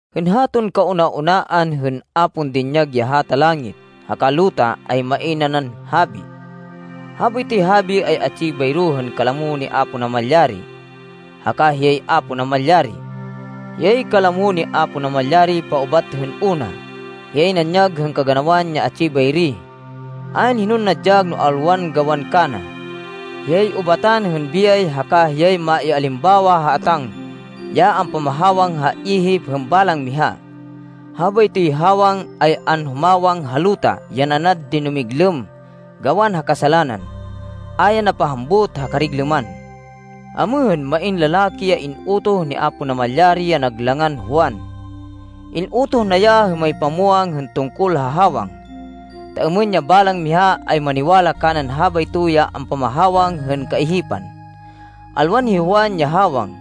Hên haton kauna-unaan hên a pon dinyag ya hata langit, haka luta ay main nanan Habi. Habaytoy Habi ay atsi bayro hên kalamo ni Apo Namalyari, haka hiyay Apo Namalyari. Hiyay kalamo ni Apo Namalyari paubat hên una. Hiyay nanyag hên kaganawan ya atsi bayri. Ayn hinon nadyag no alwan gawan kana. Hiyay ubatan hên biyay haka hiyay maialimbawa ha atáng ya ampamahawang ha ihip hên balang miha. Habaytoy hawang ay anhumawang ha luta ya nanad dinumiglêm gawan ha kasalanan. A ya napahambut ha kariglêman. Amêhên, main lalaki ya in-utoh ni Apo Namalyari, ya nag langan Juan. In-utoh na ya hên mamipamwang hên tungkol ha hawang, ta êmên ya balang miha ay maniwala kanan habayto ya ampamahawang hên kaihipan. Alwan hi Juan ya hawang,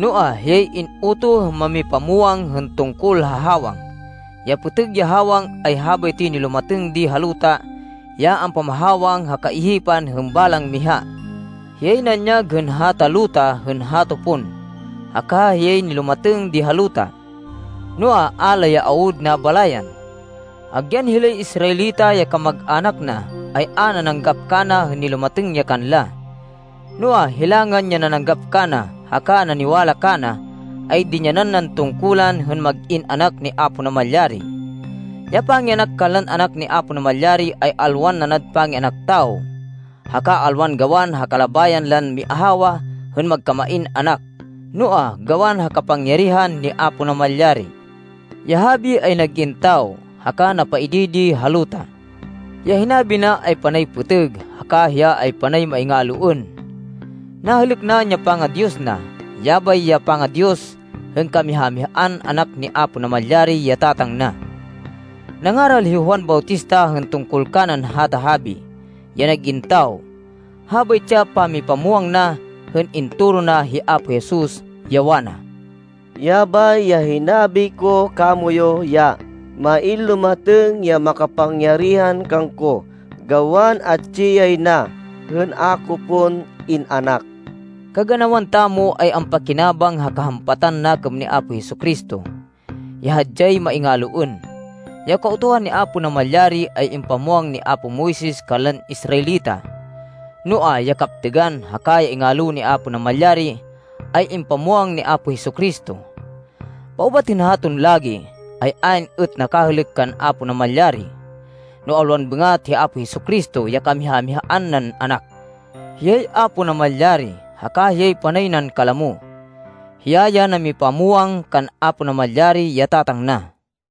noa, hiyay in-utoh hên mamipamwang hên tungkol ha hawang. Ya pêtêg ya hawang, ay habaytoy nilumatêng di ha luta ya ampamahawang ha kaihipan hên balang miha. Hiyay nanyag hên hata luta hên hato pon, haka hiyay nilumatêng di ha luta. Noa, a la ya awud nabalayan. Agyan hilay Israelita ya kamag-anak na, ay a nananggap kana hên nilumatêng ya kanla. Noa, hilangan ya nananggap kana, haka naniwala kana, ay dinyanan nan tungkulan hên mag-in anak ni Apo Namalyari. Ya pangianak kanlan anak ni Apo Namalyari, ay alwan nanad pangianak tawo, haka alwan gawan ha kalabayan lan miahawa hên magkamain anak, noa, gawan ha kapangyarihan ni Apo Namalyari. Ya Habi ay nag-in tawo, haka napaidi di ha luta. Ya hinabi na ay panay pêtêg haka hiya ay panay maingaloên. Nahêlêk naên ya panga-Diyos na. Yabay ya panga-Diyos hên kamiha-mihaan Anak ni Apo Namalyari, ya Tatang na. Nangaral hi Juan Bautista hên tungkol kanan hata Habi ya nag-in tawo. Habaytsi ya pamipamwang na, hên intoro na hi Apo Jesus, ya wana, “Yabay ya hinabi ko kamoyu ya ‘main lumatêng ya makapangyarihan kangko, gawan atsi yay na, hên a ko pon in-anak.’” Kaganawan tamo ay ampakinabang ha kahampatan nakêm ni Apo Jesu-Cristo, ya hadyay maingaloên. Ya Kautuhan ni Apo Namalyari, ay impamwang ni apo Moises kanlan Israelita, noa, ya kaptêgan, haka ya ingalo ni Apo Namalyari, ay impamwang ni Apo Jesu-Cristo. Paubat hên haton lagi, ay ayn êt nakahêlêk kan Apo Namalyari, no alwan bêngat hi Apo Jesu-Cristo ya kamiha-mihaan nan Anak. Hiyay Apo Namalyari, haka hiyay panay nan kalamo. Hiya ya namipamwang kan Apo Namalyari, ya Tatang na.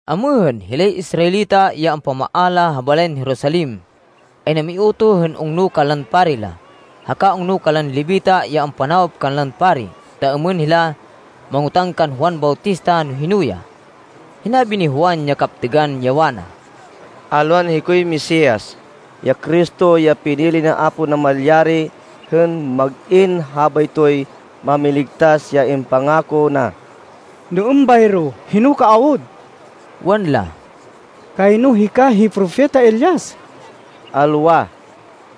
Amêhên, hilay Israelita, ya ampamaala ha balayan Jerusalem, ay namiutoh hên ungno kanlan pari la, haka ungno kanlan Levita ya ampanawop kanlan pari, ta êmên hila mangotáng kan Juan Bautista no hino ya. Hinabi ni Juan ya kaptêgan, ya wana, “Alwan hikoy Mesias, ya Cristo, ya pinili ni Apo Namalyari hên mag-in habaytoy Mámiligtas ya impangako na.” “No êmbayro, hino ka awud?” wanla. “Kayno hika hi Propeta Elias!” “Alwa.”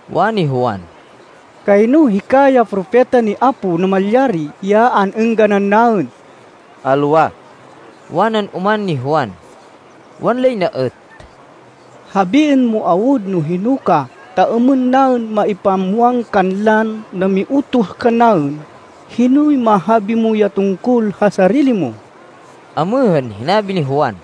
wani Juan. “Kayno hika ya Propeta ni Apo Namalyari, ya an-êngganan naên!” “Alwa.” wanan oman ni Juan. Wanlay na êt, “Habiên mo awud no hino ka, ta êmên naên maipamwang kanlan namiutoh kannaên. Hinoy mahabi mo ya tungkol ha sarili mo?” Amêhên, hinabi ni Juan,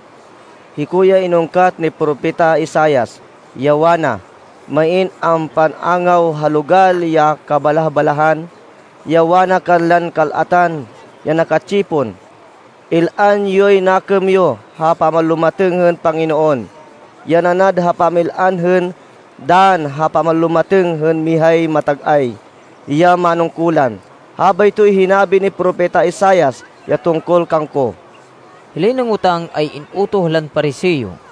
“Hiko ya inungkat ni Propeta Isaias, ya wana, ‘Main ampan-angaw ha logal ya kabalah-balahan, ya wana kanlan kal-atan ya naka-tsipon, “Il-an yoy nakêm yo ha pamanlumatêng hên Panginoon, Ya nanad ha pamil-an hên dann ha pamanlumatêng hên mihay matag-ay ya manungkulan.”’ Habaytoy hinabi ni Propeta Isaias ya tungkol kangko.” Hilay nangotang, ay in-utoh lan Pariseo.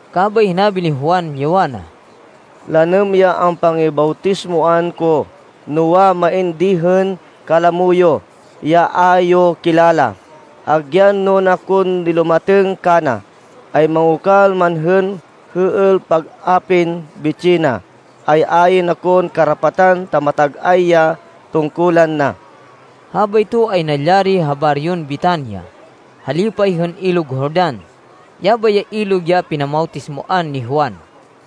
Kabay hinabi ni Juan, ya wana, “Lanêm ya ampangibawtismoan ko, noa, main di hên kalamo yo, ya a yo kilala. Agyan nuna kon nilumatêng kana, ay mangokal man hên hêêl pag-apin bitsih na, ay ayn akon karapatan ta matag-ay ya tungkulan na.” Habayto ay nalyari ha baryon Betania, ha lipay hên Ilog Jordan. Yabay ya ilog ya pinamawtismoan ni Juan.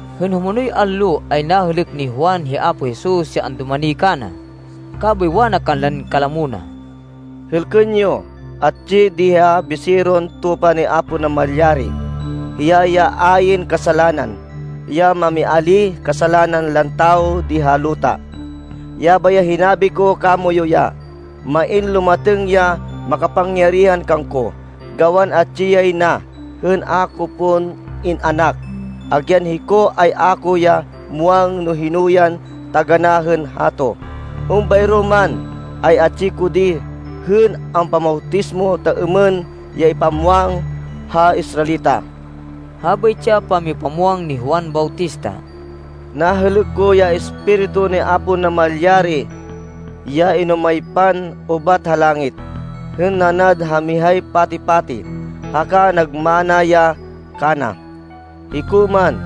Hên humonoy allo, ay nahêlêk ni Juan hi Apo Jesus ya andumani kana. Kabay wana kanlan kalamo na, “Hêlkên yo! Atsi di ya Biseron Tupa ni Apo Namalyari. Hiya ya ayn kasalanan, ya mamialíh kasalanan lan tawo di ha luta. Yabay ya hinabi ko kamoyu ya ‘main lumatêng ya makapangyarihan kangko, gawan atsi yay na, hên a ko pon in-anak.’ Agyan hiko, ay a ko ya muwang no hino yan taganá hên hato. Êmbayro man, ay atsi ko di, hên ampamawtismo ta êmên ya ipamwang ha Israelita.” Habaytsi ya pamipamwang ni Juan Bautista, “Nahêlêk ko ya Espiritu ni Apo Namalyari ya inumaypan ubat ha langit, hên nanad ha mihay pati-pati, haka nagmana ya kana. Hiko man,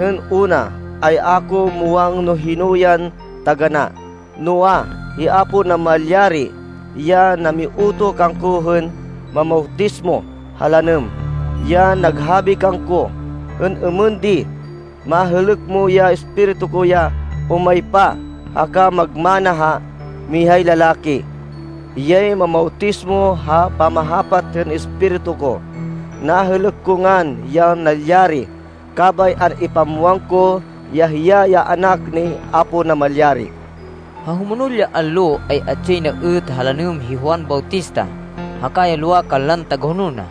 hên una, ay a ko muwang no hino yan taganá. Noa, hi Apo Namalyari, ya namiutoh kangko hên mamawtismo ha lanêm, ya naghabi kangko, hên êmên di, ‘Mahêlêk mo ya Espiritu ko ya umaypa haka magmana ha mihay lalaki. Hiyay mamawtismo ha pamahapat hên Espiritu ko.’ Nahêlêk ko ngan ya nalyari, kabay an-ipamwang ko ya hiya ya Anak ni Apo Namalyari.” Ha humonol ya allo, ay atsi yay na êt ha lanêm hi Juan Bautista haka ya lowa kanlan tagahonol na.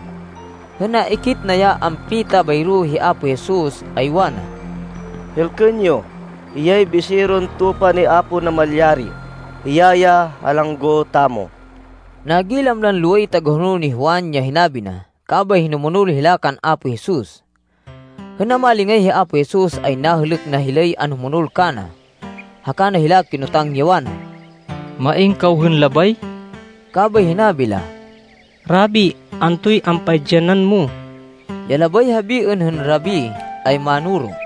Hên naikit na ya ampita bayro hi Apo Jesus, ay wana, “Hêlkên yo! Hiyay Biseron Tupa ni Apo Namalyari. Hiya ya halanggo tamo.” Nagilam lan loway tagahonol ni Juan ya hinabi na, kabay hinumonol hila kan Apo Jesus. Hên namalingay hi Apo Jesus ay nahêlêk na hilay anhumonol kana haka na hila kinotang, ya wana, “Main kaw hên labay?” Kabay hinabi la, “Rabi, antoy ampaidyanan mo?” (Ya labay habiên hên Rabi ay Mánoro.)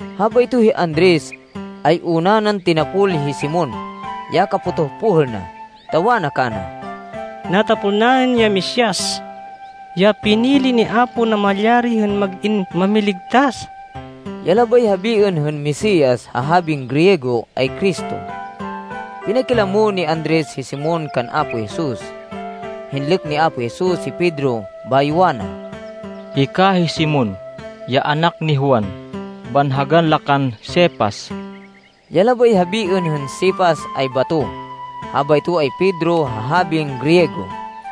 Habayto hi Andres, ay una nan tinapol hi Simon, ya kapotoh pohêl na, ta wana kana, “Natapol naên ya Mesias, ya pinili ni Apo Namalyari hên mag-in Mámiligtas!” (Ya labay habiên hên Mesias ha habin Griego ay Cristo.) Pinakilamo ni Andres hi Simon kan Apo Jesus. Hinlêk ni Apo Jesus hi Pedro, bayo wana, “Hika hi Simon, ya anak ni Juan. Banhagan la kan Cefas.” (Ya labay habiên hên Cefas ay bato. Habayto ay Pedro ha habin Griego.)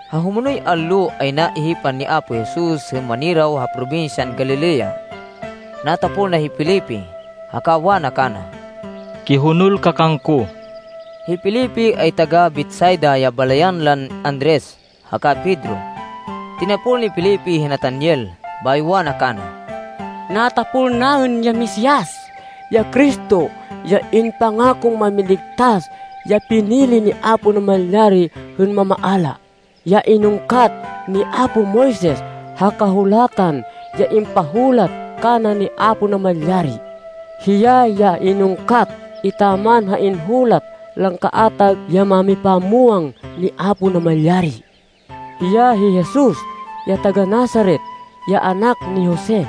Ha humonoy allo, ay naihipan ni Apo Jesus hên maniraw ha probinsyan Galilea. Natapol na hi Felipe, haka wana kana, “Kihonol ka kangko.” Hi Felipe ay taga-Betsaida ya balayan lan Andres haka Pedro. Tinapol ni Felipe hi Natanael, bayo wana kana, “Natapol naên ya Mesias, ya Cristo, ya impangakon Mámiligtas ya pinili ni Apo Namalyari hên mamaala, ya inungkat ni apo Moises ha Kahulatan ya impahulat kana ni Apo Namalyari. Hiya ya inungkat etaman ha inhulat lan kaatag ya mámipamwang ni Apo Namalyari. Hiya hi Jesus, ya taga-Nazaret, ya anak ni Jose.”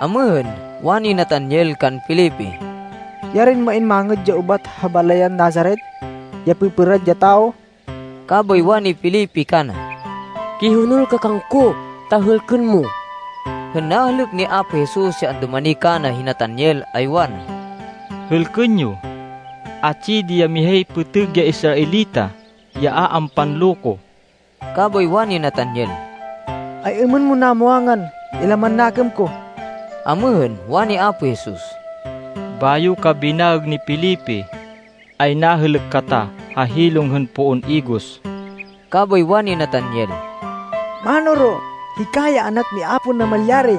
Amêhên, wani Natanael kan Felipe, “Yarin main mangêd ya ubat ha balayan Nazaret, ya pêpêrad ya tawo?” Kabay wani Felipe kana, “Kihonol ka kangko ta hêlkên mo.” Hên nahêlêk ni Apo Jesus ya andumani kana hi Natanael, ay wana, “Hêlkên yo! Atsi di ya mihay pêtêg ya Israelita ya a ampanloko.” Kabay wani Natanael, “Ay-êmên mon namwangan ya laman nakêm ko?” Amêhên, wani Apo Jesus, “Bayo ka binaêg ni Felipe ay nahêlêk kata ha hilong hên poon igos.” Kabay wani Natanael, “Mánoro, hika ya Anak ni Apo Namalyari!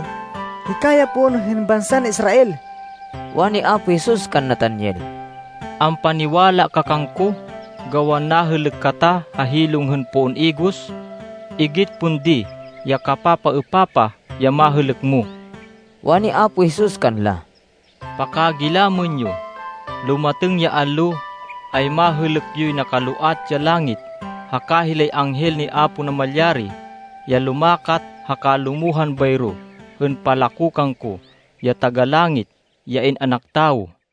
Hika ya Poon hên bansan Israel.” Wani Apo Jesus kan Natanael, “Ampaniwala ka kangko gawan nahêlêk kata ha hilong hên poon igos. Igit pon di ya kapapaêpapah ya mahêlêk mo.” Wani Apo Jesus kanla, “Pakagilamên yo, lumatêng ya allo, ay mahêlêk yoy nakaloat ya langit, haka hilay anghel ni Apo Namalyari ya lumakat haka lumohan bayro, hên palako kangko, ya Taga-Langit, ya In-anak Tawo.”